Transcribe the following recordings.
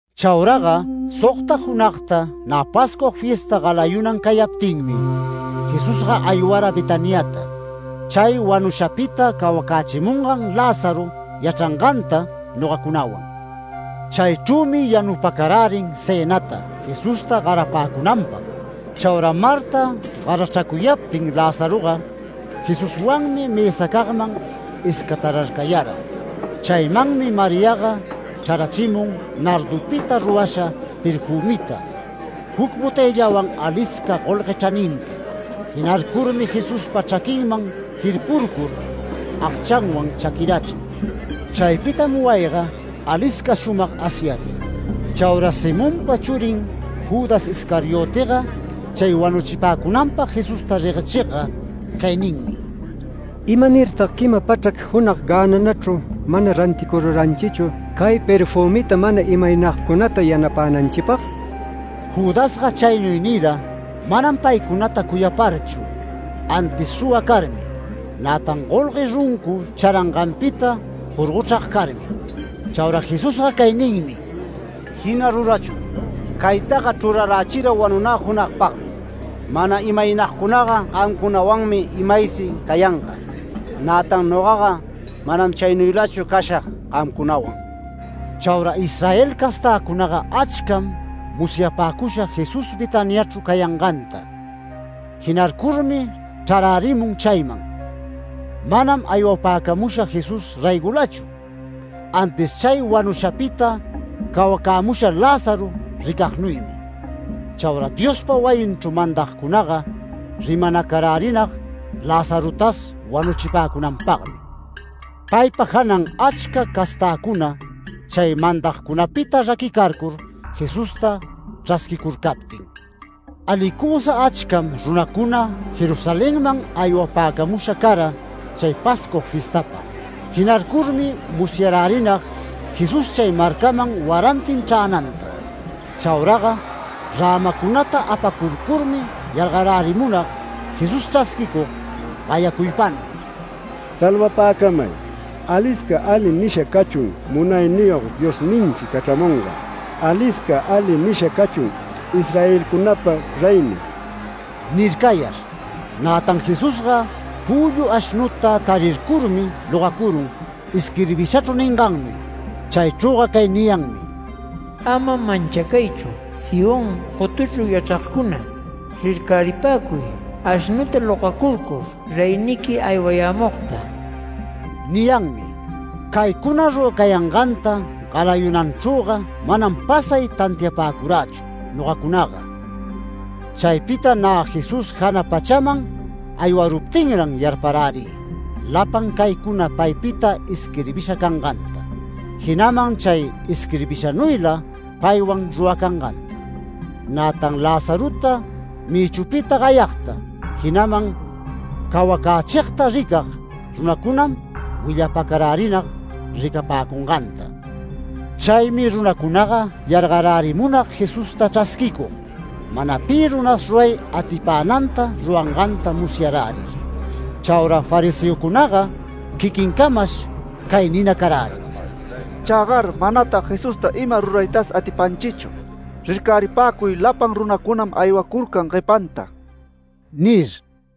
Chauraga sogta junagta nä Pascua fiesta galayunan cayaptinmi, Jesusga aywara Betaniata chay wanushapita cawacächimungan Lázaro yachranganta nogacunawan. Chaychrümi yanupäcarärin cënata Jesusta garapäcunanpag. Chaura Marta garachracuyaptin Lazaroga, Jesuswanmi mësacagman iscatararcayara. Chaymanmi Mariaga chrarachimun nardupita rurasha perfümita juc botëllawan alisca golgue chraninta. Jinarcurmi Jesuspa chraquinman jirpurcur, agchanwan chaquirachin. Chaypita wayiga ima-ayga shumag asyarun. Chaura Simonpa churin Judas Iscariotega chay wanuchipäcunanpag Jesusta reguechigga cay ninmi: “¿Imanirtag quima pachrac junag gänanachru mana ranticururanchichu cay perfümita mana imaynagcunata yanapänanchipag?” Judasga chaynuy nira manam paycunata cuyaparchu antis suwa carmi, nätan golgue runcu charanganpita jorgochrag carmi. Chaura Jesusga cay ninmi: “Jina rurachun. Caytaga chrurarächira wanunä junagpagmi. Mana imaynagcunaga gamcunawanmi imaysi cayanga. Nätan nogaga manam chaynuylachu cashag gamcunawan”. Chaura Israel castäcunaga achcam musyapäcusha Jesús Betaniachru cayanganta. Jinarcurmi chrarärimun chayman. Manam aywapäcamusha Jesús raygolachu, antis chay wanushapita cawacämusha Lázaro ricagnuymi. Chaura Diospa wayinchru mandagcunaga rimanacarärinag Lazarotas wanuchipäcunanpagmi. Paypa janan achca castäcuna chay mandagcunapita raquicarcur Jesusta chrasquicurcaptin. Alicusa achcam runacuna Jerusalenman aywapäcamusha cara chay Pascua fiestapag. Jinarcurmi musyarärinag Jesús chay marcaman warantin chränanta. Chauraga rämacunata apacurcurmi yargarärimunag Jesús chrasquicug gayacuypanuy: “¡Salvapäcamay! Alisca ali nisha cachun Munayniyog Diosninchi cachramungan. ¡Alisca ali nisha cachun Israelcunapa reynin!” nircayar. Nätan Jesusga püllu ashnuta tarircurmi logacurun isquirbishachru ningannuy. Chaychrüga cay niyanmi: “Ama manchacaychu Sión gotuchru yachragcuna. ¡Rircaripäcuy ashnuta logacurcur reyniqui aywayämugta!” niyanmi. Caycuna ruracayanganta galayunalanchrüga manam pasay tantiapäcurächu nogacunaga. Chaypita nä Jesús jana pachaman aywaruptinran yarparärï lapan caycuna paypita isquirbisha canganta. Jinaman chay isquirbishanuyla paywan ruracanganta. Nätan Lazarota mïchupita gayagta, jinaman cawacächigta ricag runacunam willapacarärinag ricapäcunganta. Chaymi runacunaga yargarärimunag Jesusta chrasquicug, mana pi runas ruray atipänanta ruranganta musyarärir. Chaura fariseocunaga quiquincamash cay ninacarärin: “Chägar manatag Jesusta ima ruraytas atipanchichu. Rircaripäcuy lapan runacunam aywacurcan guepanta” nir.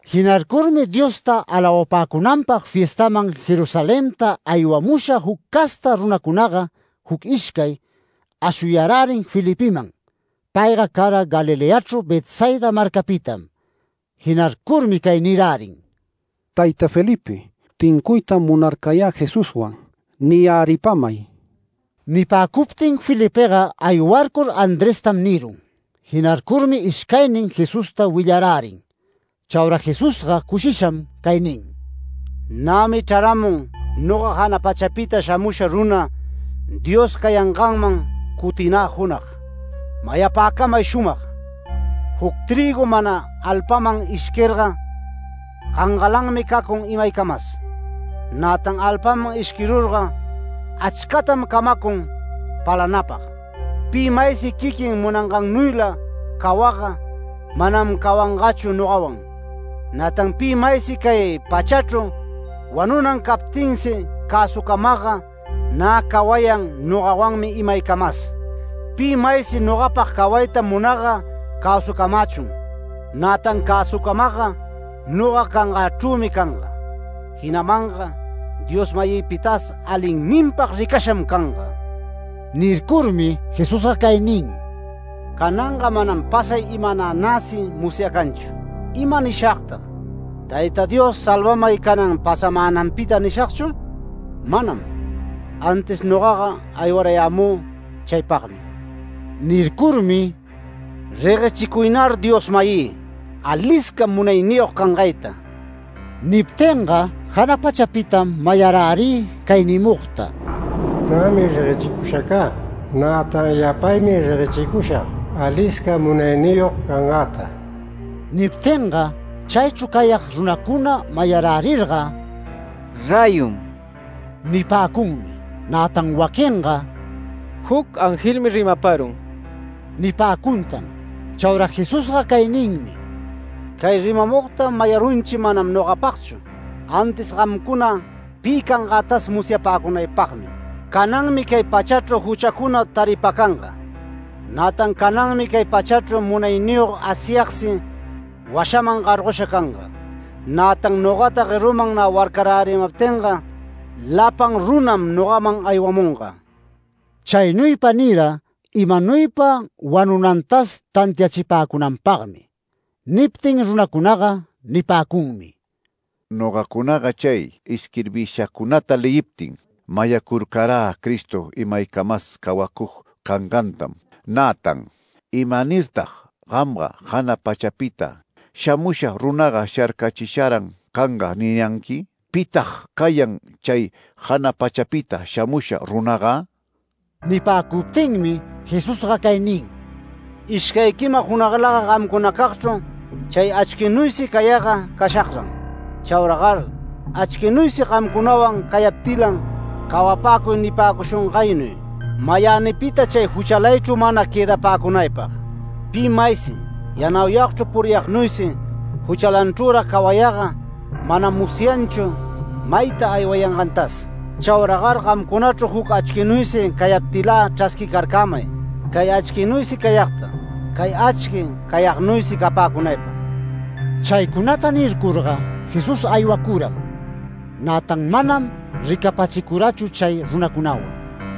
Jinarcurmi Diosta alawapäcunanpag fiestaman Jerusalenta aywamusha juc casta runacunaga juc ishcay, ashuyarärin Felipeman. Payga cara Galileachru Betsaida marcapitam. Jinarcurmi cay nirärin: “Tayta Felipe, tincuytam munarcayä Jesuswan niyäripamay”. Nipäcuptin Felipega aywarcur Andrestam nirun. Jinarcurmi ishcaynin Jesusta willarärin. Chaura Jesusga cushisham cay nin: “Nämi chraramun noga jana pachapita shamusha runa, Dios cayanganman cuticunä junag. Mayapäcamay shumag: Juc trïgu mana alpaman ishquirga, gangalanmi cacun imaycamas, nätan alpaman ishquirurga achcatam camacun palanapag. Pi maysi quiquin munangannuyla cawagga manam cawangachu nogawan. Nätan pi maysi cay pachachru wanunan captinsi cäsucamagga nä cawayan nogawanmi imaycamas. Pi maysi nogapag cawayta munagga cäsucamächun, nätan cäsucamagga noga cangächrümi canga. Jinamanga Dios-mayïpitas alinninpag ricasham canga”. Nircurmi Jesusga cay nin: “Cananga manam pasay imananäsi musyacanchu. ¿Ima nishagtag ‘Tayta Dios, salvamay canan pasamänanpita’ nishagchur? Manam. Antis nogaga aywarayämü chaypagmi”. Nircurmi “Reguechicuynar Dios-mayï, alisca munayniyog cangayta”. Niptinga jana pachapitam mayarärï cay nimugta: “Nämi reguechicusha cä. Nätan yapaymi reguechicushag alisca munayniyog cangäta”. Niptinga chaychru cayag runacuna mayarärirga “Räyum” nipäcunmi. Nätan waquinga “Juc angelmi rimaparun” nipäcuntan. Chaura Jesusga cay ninmi: “Cay rimamugta mayarunchi manam nogapagchu, antis gamcuna pi cangätas musyapäcunaypagmi. Cananmi cay pachachru juchacuna taripacanga. Nätan cananmi cay pachachru munayniyog Asyagsi washaman gargosha canga. Nätan nogata gueruman nä warcarärimaptinga lapan runam nogaman aywamunga”. Chaynuypa nira, imanuypa wanunantas tantiachipäcunanpagmi. Niptin runacunaga nipäcunmi: “Nogacunaga chay isquirbishacunata leyiptin, mayacurcarä Cristo imaycamas cawacug cangantam. Nätan ¿imanirtag ‘Gamga jana pachapita shamusha runaga sharcachisharan canga’ niyanqui? ¿Pitag cayan chay jana pachapita shamusha runaga?” Nipäcuptinmi Jesusga cay nin: “Ishcay quima junaglaga gamcunacagchru chay achquinuysi cayagga cashagran. Chauragar achquinuysi gamcunawan cayaptilan cawapäcuy nipäcushungaynuy, mayänipita chay juchalaychru mana quëdapäcunaypag. Pi maysi, yanauyagchru puriyagnuysi juchalanchrürag cawayagga manam musyanchu mayta aywayangantas. Chauragar gamcunachru juc achquinuysi cayaptilä chrasquicarcämay, cay achquinuysi cayagta, cay achqui cayagnuysi capäcunaypag”. Chaycunata nircurga, Jesús aywacuram. Nätan manam ricapachicurachu chay runacunawan.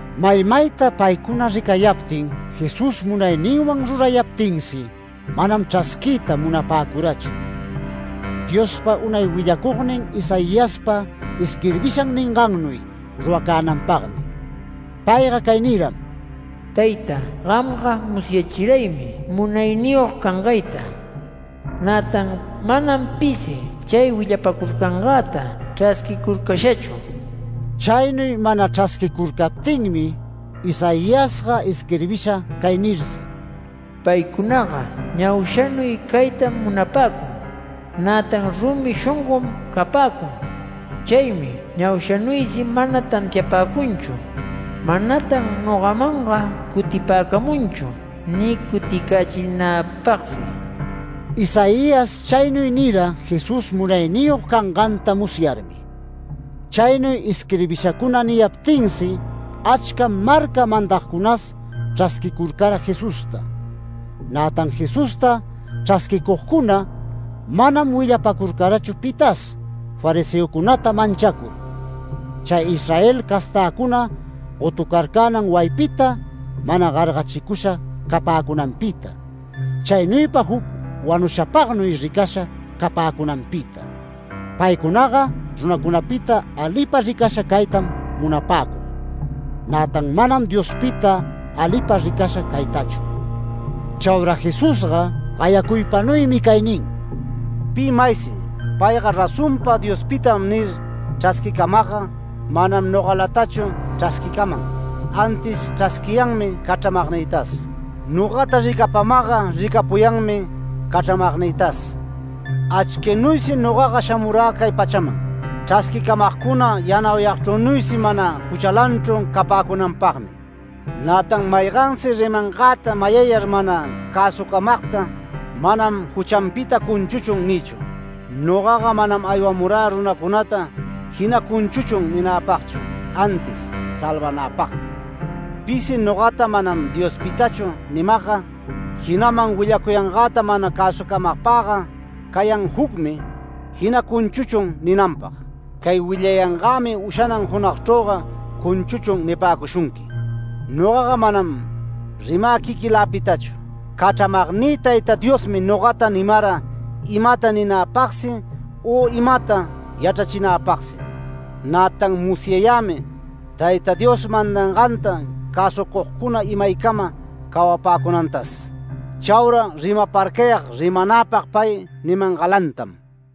Maymayta paycuna ricayaptin Jesús munayninwan rurayaptinsi manam chrasquiyta munapäcurachu. Diospa unay willacugnin Isaiaspa isquirbishan ningannuy ruracänanpagmi. Payga cay niram: “Tayta, gamga musyachiraymi munayniyog cangayta. Nätan manam pisi chay willapacurcangäta chrasquicurcashachu”. Chaynuy mana chrasquicurcaptinmi Isaiasga isquirbisha cay nirsi: “Paycunaga ñaushanuy caytam munapäcun, nätan rumi shongom capäcun, chaymi ñaushanuysi mana tantiapäcunchu. Manatan nogamanga cutipäcamunchu ni cuticächinäpagsi”. Isaías chaynuy nira Jesús munayniyog canganta musyarmi. Chaynuy isquirbishacuna niyaptinsi achcam marca mandagcunas chrasquicurcara Jesusta. Nätan Jesusta chrasquicugcuna manam willapacurcarachu pitas fariseocunata manchacur, chay Israel castäcuna gotucarcänan wayipita mana gargachicusha capäcunanpita, chaynuypa juc wanushapagnuy ricasha capäcunanpita. Paycunaga runacunapita alipa ricasha caytam munapäcug, nätan manam Diospita alipa ricasha caytachu. Chaura Jesusga gayacuypanuymi cay nin: “Pi maysi ‘Payga razonpa Diospitam’ nir chrasquicamagga, manam nogalatachu chrasquicaman, antis chrasquiyanmi cachramagnïtas. Nogata ricapamagga, ricapuyanmi cachramagnïtas. Achquinuysi nogaga shamurä cay pachaman, chrasquicamagcuna yanauyagchrünuysi mana juchalanchru capäcunanpagmi. Nätan maygansi rimangäta mayayar mana cäsucamagta manam ‘Juchanpita cunchuchun’ nïchu. Nogaga manam aywamurä runacunata ‘Jina cunchuchun’ ninäpagchu, antis salvanäpagmi. Pisi ‘Nogata manam Diospitachu’ nimagga, jinaman willacuyangäta mana cäsucamagpagga cayan jucmi ‘Jina cunchuchun’ ninanpag. Cay willayangämi ushanan junagchrüga ‘Cunchuchun’ nipäcushunqui. Nogaga manam rimä quiquiläpitachu. Cachramagnï Tayta Diosmi nogata nimara imata ninäpagsi u imata yachrachinagpagsi. Nätan musyayämi Tayta Dios mandanganta cäsucugcuna imaycama cawapäcunantas. Chaura rimaparcayag rimanäpag pay nimangalantam”.